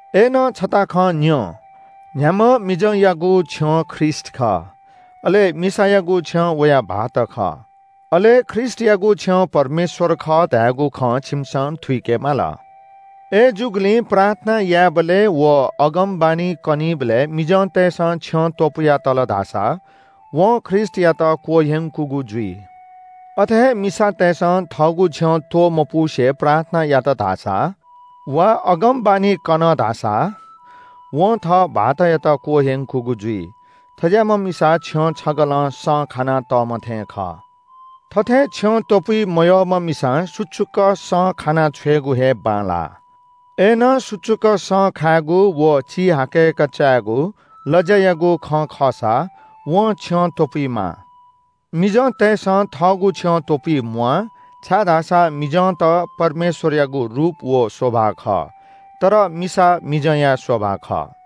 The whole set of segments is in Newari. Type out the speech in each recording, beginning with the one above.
अय्‌नं छता खँ न्‍यँ – न्‍ह्याम्‍ह मिजंयागु छ्यं ख्रीष्‍ट खः, अले मिसायागु छ्यं वया भाःत खः, अले ख्रीष्‍टयागु छ्यं परमेश्‍वर खः धयागु खँ छिमिसं थुइके माल। अय्‌जूगुलिं प्रार्थना यायेबलय् व अगमवाणी कनीबलय् मिजंतय्‌सं छ्यं त्‍वपुया तल धाःसा वं ख्रीष्‍टयात क्‍वह्यंकूगु जुइ। अथे हे मिसातय्‌सं थःगु छ्यं त्‍वमपुसे प्रार्थना यात धाःसा वा अगमवाणी कन धाःसा वं थः भाःतयात क्‍वह्यंकूगु जुइ। थज्‍याःम्‍ह मिसा छ्यं छगलं सँ खाना तःम्‍ह थें खः। थथे छ्यं त्‍वपुइ मयःम्‍ह मिसां सुचुक सँ खाना छ्वयेगु हे बांलाः। अय्‌नं सुचुक सँ खायेगु व चिहाकय्‌क चायेगु लज्‍यायागु खँ खःसा वं छ्यं त्‍वपुइमाः। मिजंतय्‌सं थःगु छ्यं त्‍वपुइ म्‍वाः छाय्‌धाःसा मिजंत परमेश्‍वरयागु रूप व शोभा खः, तर मिसा मिजंया शोभा खः।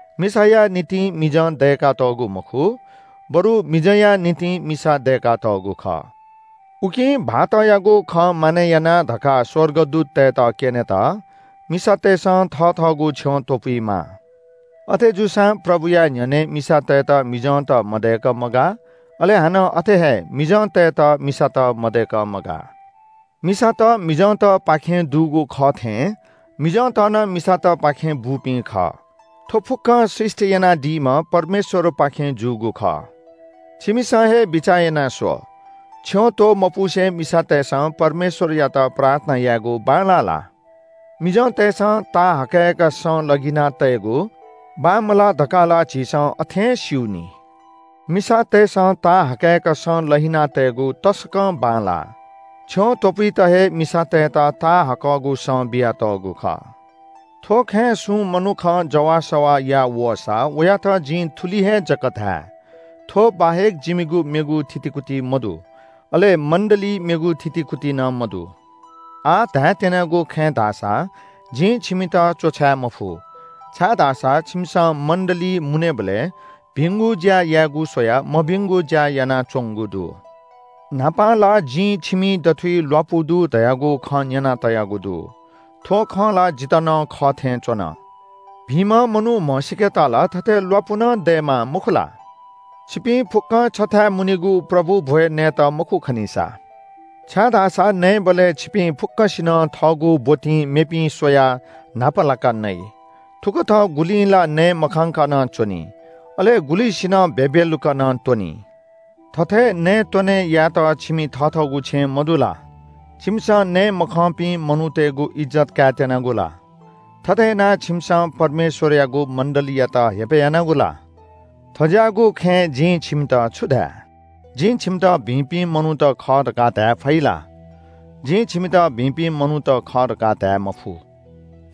मिसाया निंतिं मिजं दय्‌कातःगु मखु, बरु मिजंया निंतिं मिसा दय्‌कातःगु खः। उकिं भाःतयागु खँ मानय् याना धकाः स्‍वर्गदूततय्‌त क्‍यनेत मिसातय्‌सं थथःगु छ्यं त्‍वपुइमाः। अथेजूसां प्रभुया न्‍ह्यःने मिसातय्‌त मिजंत मदय्‌क मगाः, अले हानं अथे हे मिजंतय्‌त मिसात मदय्‌क मगाः। मिसात मिजंतय्‌पाखें दुगु खः थें मिजंत नं मिसातय्‌पाखें बूपिं खः। थ्‍व फुक्‍कं सृष्‍टि यानादीम्‍ह परमेश्‍वरपाखें जूगु खः। छिमिसं हे बिचाः याना स्‍व – छ्यं त्‍वमपुसे मिसातय्‌सं परमेश्‍वरयात प्रार्थना यायेगु बांलाः ला? मिजंतय्‌सं ताहाःकय्‌क सँ लहिना तयेगु बांमलाः धकाः ला झीसं अथें स्‍यू नि। मिसातय्‌सं ताहाःकय्‌क सँ लहिना तयेगु तसकं बांलाः। छ्यं त्‍वपुइत हे मिसातय्‌त ताहाःकगु सँ बियातःगु खः। थ्‍व खँय् सुं मनुखं जवाःसवाः याः वःसा वयात जिं थुलि हे जक धाये – थ्‍व बाहेक जिमिगु मेगु थितिकुति मदु। अले मण्‍डलीइ मेगु थितिकुति नं मदु। आः धायेत्‍यनागु खँय् धाःसा जिं छिमित च्‍वछाय् मफु, छाय्‌धाःसा छिमिसं मण्‍डलीइ मुनेबलय् भिंगु ज्‍या यायेगु स्‍वयाः मभिंगु ज्‍या यानाच्‍वंगु दु। न्‍हापां ला जिं छिमि दथुइ ल्‍वापु दु धयागु खँ न्‍यना तयागु दु। थ्‍व खँ ला जितः नं खः थें च्‍वन। भिंम्‍ह मनू म्‍हसीकेत ला थथे ल्‍वापु नं दयेमाः मखु ला? छिपिं फुक्‍कं छथाय् मुनीगु प्रभु भ्‍वय् नयेत मखु खनिसा छाय्‌धाःसा नयेबलय् छिपिं फुक्‍कसिनं थःगु ब्‍वतिं मेपिं स्‍वयाः न्‍हापालाका नइ। थुकथं गुलिं ला नये मखंका नं च्‍वनी, अले गुलिसिनं भ्‍यभ्‍यलुक्‍क नं त्‍वनी। थथे नयेत्‍वने यायेत छिमि थथःगु छेँ मदु ला? छिमिसं नये मखंपिं मनूतय्‌गु इज्‍जत कायेत्‍यनागु ला? थथे यानाः छिमिसं परमेश्‍वरयागु मण्‍डलीयात हेपय् यानागु ला? थज्‍याःगु खँय् जिं छिमित छु धाये? जिं छिमित भिंपिं मनूत खः धकाः धाये फइ ला? जिं छिमित भिंपिं मनूत खः धकाः धाये मफु।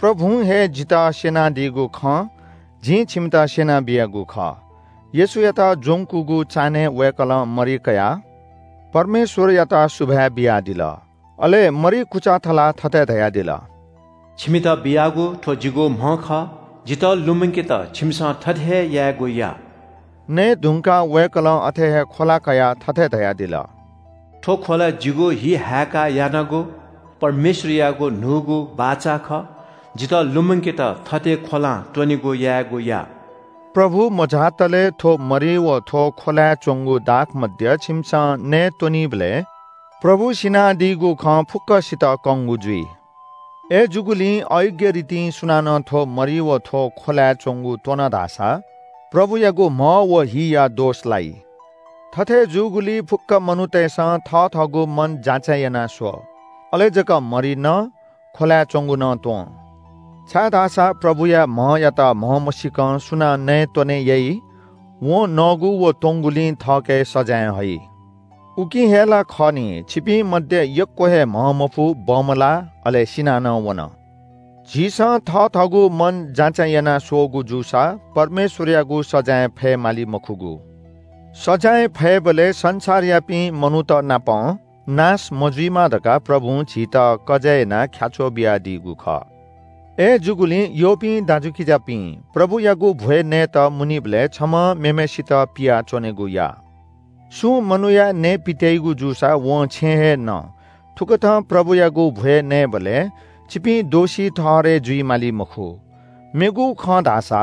प्रभुं हे जितः स्‍यनादीगु खँ जिं छिमित स्‍यना बियागु खः। येशूयात ज्‍वंकूगु चान्‍हय् वय्‌कलं मरि कयाः परमेश्‍वरयात सुभाय् बियादिल। अले मरि कुचा थलाः थथे धयादिल – “छिमित बियागु थ्‍व जिगु म्‍ह खः। जितः लुमंकेत छिमिसं थथे हे यायेगु या।” नये धुंकाः वय्‌कलं अथे हे ख्‍वला कयाः थथे धयादिल – “थ्‍व ख्‍वला जिगु हि हाय्‌काः यानागु परमेश्‍वरयागु न्‍हूगु बाचा खः। जितः लुमंकेत थथे ख्‍वलां त्‍वनेगु यायेगु या।” प्रभु मझातले थ्‍व मरि व थ्‍व ख्‍वलाय् च्‍वंगु दाखमद्य छिमिसं नयेत्‍वनीबलय् प्रभु सिनादीगु खँ फुक्‍कसित कंगु जुइ। अय्‌जूगुलिं अयोग्‍य रितिं सुनानं थ्‍व मरि व थ्‍व ख्‍वलाय् च्‍वंगु त्‍वन धाःसा प्रभुयागु म्‍ह व हिया दोष लाइ। थथे जूगुलिं फुक्‍क मनूतय्‌सं थथःगु मन जाँचय् याना स्‍व। अले जक मरि न, ख्‍वलाय् च्‍वंगु नं त्‍वँ। छाय्‌धाःसा प्रभुया म्‍हयात म्‍हमसीकं सुनां नयेत्‍वने याइ वं नःगु व त्‍वंगुलिं थःके सजाँय हइ। उकिं हे ला खः नि, छिपिं मध्‍ये यक्‍व हे म्‍हंमफु, बमलाः अले सिना नं वन। झीसं थथःगु मन जाँचय् याना स्‍वःगु जूसा परमेश्‍वरयागु सजाँय फयेमाली मखुगु। सजाँय फयेबलय् संसारयापिं मनूतनापं नाश मजुइमा धकाः प्रभुं झीत कजय् यानाः ख्‍याच्‍वः बियादीगु खः। अय्‌जूगुलिं यःपिं दाजुकिजापिं, प्रभुयागु भ्‍वय् नयेत मुनीबलय् छम्‍हं मेम्‍हय्‌सित पियाच्‍वनेगु या। सुं मनूया नयेपित्‍याइगु जूसा वं छेँय् हे न। थुकथं प्रभुयागु भ्‍वय् नयेबलय् छिपिं दोषी ठहरय् जुइ माली मखु। मेगु खँ धाःसा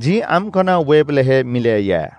जिं आम्‍कन वयेबलय् हे मिलय् याये।